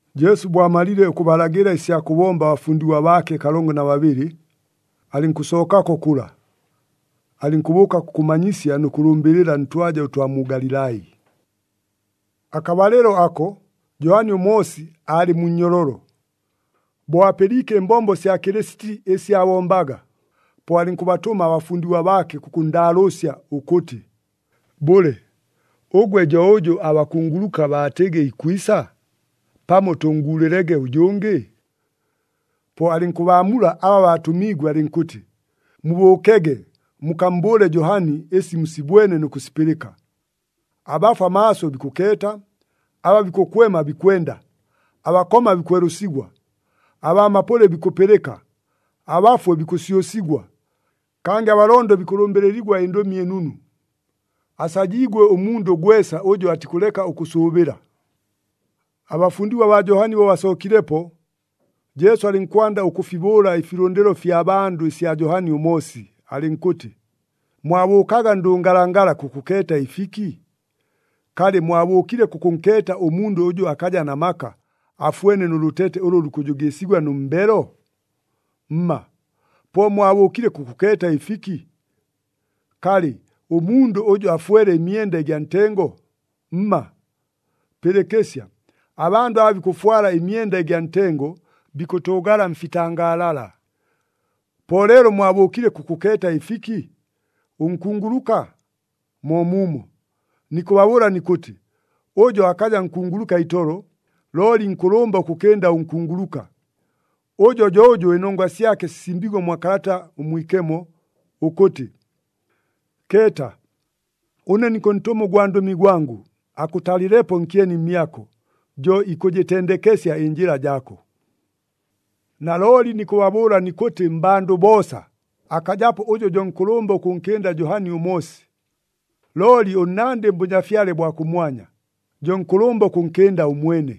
Jesu bo amalile ʉkʉbalagɨla ɨsya kʉbomba abafundigwa baake kalongo na babɨlɨ, alɨnkʉsookako kʉla. Alɨnkʉbʉʉka kʉkʉmanyisya nʉ kʉlʉmbɨlɨla ntwaja ʉtwa mu Galilai. Akabalɨlo ako, Johani ʉMoosi aalɨ mu nnyololo. Bo apɨliike ɨmbombo sya Kɨlɨsiti ɨsi aabombaga, po alɨnkʉbatʉma abafundigwa baake, kʉkʉnndaalʉʉsya ʉkʉtɨ, “Bʉle, ʉgwe jo ʉjʉ abakunguluka baatɨgɨ ikwisa? Pamo tʉnnguulɨlege ʉjʉngɨ?” Po alɨnkʉbaamula aba baatʉmiigwe alɨnkʉtɨ, “Mubʉʉkege mukammbʉʉle Johani ɨsi musibwene nʉ kʉsipɨlɨka. Abafwa maaso bikʉkeeta, aba bikʉkwema bikwenda, abakoma bikwelʉsigwa, abaa mapʉlɨ bikʉpɨlɨka, abafwe bikʉsyʉsigwa, kangɨ abalondo bikʉlʉmbɨlɨligwa ɨNdʉmi ɨNunu. Asajiigwe ʉmundʉ gwesa ʉjʉ atikʉleka ʉkʉʉsʉʉbɨla.” Abafundigwa baa Johani bo basookilepo, Jesu alɨnkwanda ʉkʉfibʉʉla ɨfilʉndɨlo ɨfya bandʉ ɨsya Johani ʉMoosi, alɨnkʉtɨ, “Mwabʉʉkaga ndʉngalangala kʉkʉkeeta ɨfiki? Kalɨ, mwabʉʉkile kʉkʉnkeeta ʉmundʉ ʉjʉ akaja na maka, afwene nʉ lʉtete ʉlʉ lukʉjʉgɨɨsigwa nʉ mbelo? Mma! Po mwabʉʉkile kʉkʉkeeta ɨfiki? Kalɨ, ʉmundʉ ʉjʉ afwele ɨmyenda ɨgya ntengo? Mma! Pɨlɨkɨsya! Abandʉ aba bikʉfwala ɨmyenda ɨgya ntengo, bikʉtʉʉgala mfitangaalala. Po leelo mwabʉʉkile kʉkʉkeeta ɨfiki? Ʉnkunguluka? Moomuumo! Nikʉbabʉʉla nikʉtɨ, ʉjo akaja nkunguluka itolo, looli nkʉlʉmba ʉkʉkɨnda ʉnkunguluka. Ʉjo jo ʉjʉ ɨnongwa syake sisimbiigwe mwa Kalata ʉMwikemo, ʉkʉtɨ, ‘Keeta, ʉne nikʉntʉma ʉgwandʉmi gwangʉ, akʉtalɨlepo nkyeni mmyako, jo ikʉjɨtendekesya ɨnjɨla jaako.’ “Nalooli nikʉbabʉʉla nikʉtɨ, mmbandʉ boosa, akajapo ʉjʉ jo nkʉlʉmba ʉkʉnkɨnda Johani ʉMoosi. Looli ʉnnandɨ mBʉnyafyale bwa kʉmwanya, jo nkʉlʉmba ʉkʉnkɨnda ʉmwene.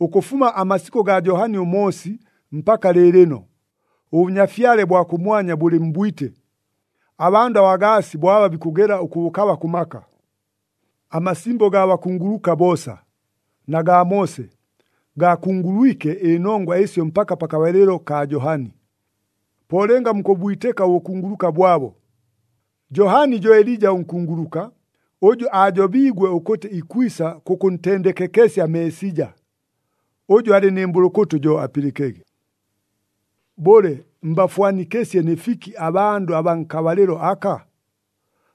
Ʉkʉfuma amasikʉ gaa Johani ʉMoosi mpaka lɨɨlɨno, ʉBʉnyafyale bwa kʉmwanya bʉlɨ mbwite. Abandʉ abagaasi bo aba bikʉgela ʉkʉbʉkaba kʉ maka. Amasimbo gaa bakunguluka boosa, na gaa Moose, gaakungulwike ɨnongwa ɨsyo mpaka pakabalɨlo kaa Johani. Po lɨnga mukʉbwitɨka ʉbʉkunguluka bwabo, Johani jo Elija ʉnkunguluka, ʉjʉ aajobiigwe ʉkʉtɨ ikwisa kʉkʉntendekekesya Meesija. Ʉjʉ alɨ nɨ mbʉlʉkʉtʉ, jo apɨlɨkege. “Bʉle, mbafwanikɨsye nɨ fiki abandʉ abaa nkabalɨlo aka?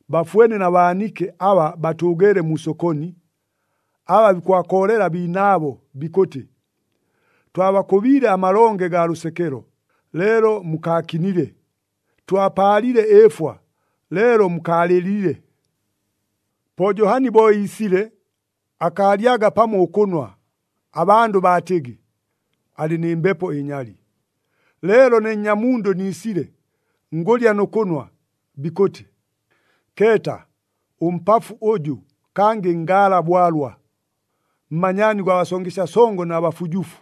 Bafwene na baanike aba batʉʉgeele mu sokoni, aba bikʉbakoolela abiinaabo bikʉtɨ, ‘Twabakʉbiile amalonge gaa lʉsekelo, leelo mukaakinile! Twapaalile ɨɨfwa, leelo mukaalɨlile!’ “Po Johani bo iisile, akaalyaga pamo ʉkʉnwa, abandʉ baatɨgɨ, ‘Alɨ nɨ mbepo ɨnyali.’ Leelo ne Nnyamundʉ niisile, ngʉlya nʉ kʉnwa, bikʉtɨ, ‘Keeta! Ʉmpafu ʉjʉ, kangɨ ngaala bwalwa! Mmanyaani gwa basongesya songo na bafujufu!’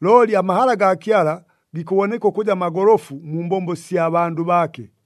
Looli amahala gaa Kyala gikʉboneka ʉkʉja magolofu mu mbombo sya bandʉ baake.”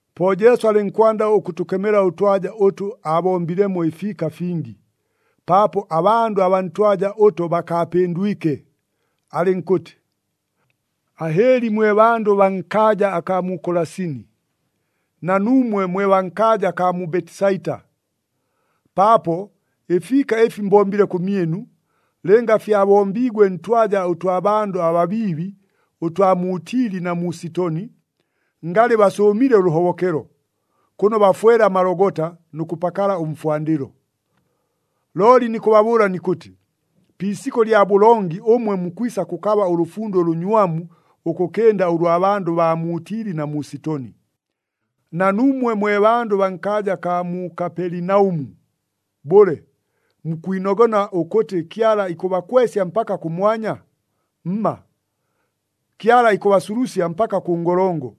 Po Jesu alɨnkwanda ʉkʉtʉkemela ʉtwaja ʉtʉ aabombilemo ɨfiika fingi, paapo abandʉ abaa ntwaja ʉto bakaapɨndwike, alɨnkʉtɨ, “Ahɨɨli mwe bandʉ baa nkaaja akaa mu Kolasini, na nuumwe mwe baa nkaaja akaa mu Betisaita! Paapo ɨfiika ɨfi mbombile kʉmyɨnu, lɨnga fyabombiigwe ntwaja ʉtwa bandʉ ababiibi ʉtwa mu Tili na mu Sitoni, ngalɨ basʉʉmile ʉlʉhobokelo, kʉno bafwele amalogota nʉ kʉpakala ʉmfwandɨlo. Looli nikʉbabʉʉla nikʉtɨ, pi isikʉ lya bʉlongi ʉmwe mukwisa kʉkaba ʉlʉfundo ʉlʉnywamu, ʉkʉkɨnda ʉlwa bandʉ baa mu Tili na mu Sitoni. Na nuumwe mwe bandʉ baa nkaaja akaa mu Kapelinaʉmu, bʉle, mukwinogona ʉkʉtɨ Kyala ikʉbakwesya mpaka kʉmwanya? Mma! Kyala ikʉbasulusya mpaka kʉ ngolongo.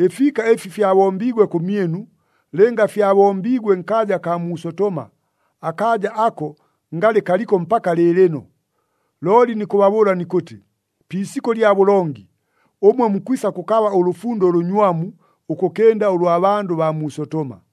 Ɨfiika ɨfi fyabombiigwe kʉmyɨnu, lɨnga fyabombiigwe nkaaja akaa mu Sotoma, akaaja ako ngalɨ kaliko mpaka lɨɨlɨno. Looli nikʉbabʉʉla nikʉtɨ, pi isikʉ lya bʉlongi, ʉmwe mukwisa kʉkaba ʉlʉfundo ʉlʉnywamu, ʉkʉkɨnda ʉlwa bandʉ baa mu Sotoma.”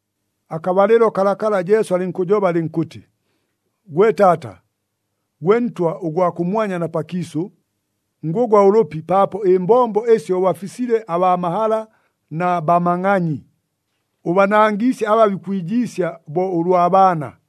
Akabalɨlo kalakala Jesu alɨnkʉjoba alɨnkʉtɨ, “Gwe Taata, gwe Ntwa ʉgwa kʉmwanya na pakiisʉ, ngʉgwa ʉlʉpi paapo ɨmbombo ɨsyo ʉbafisile abaa mahala na bamangʼanyi, ʉbanangiisye aba bikwijiisya bo ʉlwa baana.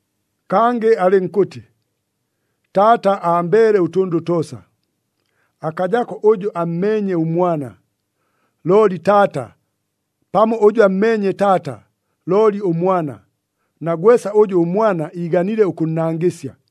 Kangɨ alɨnkʉtɨ, “Taata ambeele ʉtʉndʉ toosa. Akajako ʉjʉ ammeenye ʉMwana, looli Taata, pamo ʉjʉ ammeenye Taata looli ʉMwana, na gwesa ʉjʉ ʉMwana iiganile ʉkʉnnangɨsya.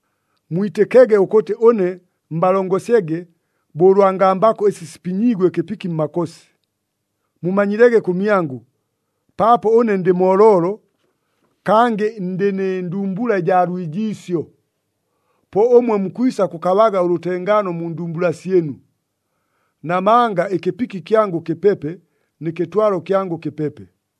Mwitɨkege ʉkʉtɨ ʉne mbalongosyege bo ʉlwa ngambakʉ ɨsi sipinyiigwe ɨkɨpiki mmakosi. Mumanyilege kʉmyangʉ, paapo ʉne ndɨ mooloolo, kangɨ ndɨ nɨ ndumbula ɨjaa lwijiisyo. Po ʉmwe mukwisa kʉkabaga ʉlʉtengaano mu ndumbula syɨnu. Namanga ɨkɨpiki kyangʉ kɨpepe, nɨ kɨtwalo kyangʉ kɨpepe.”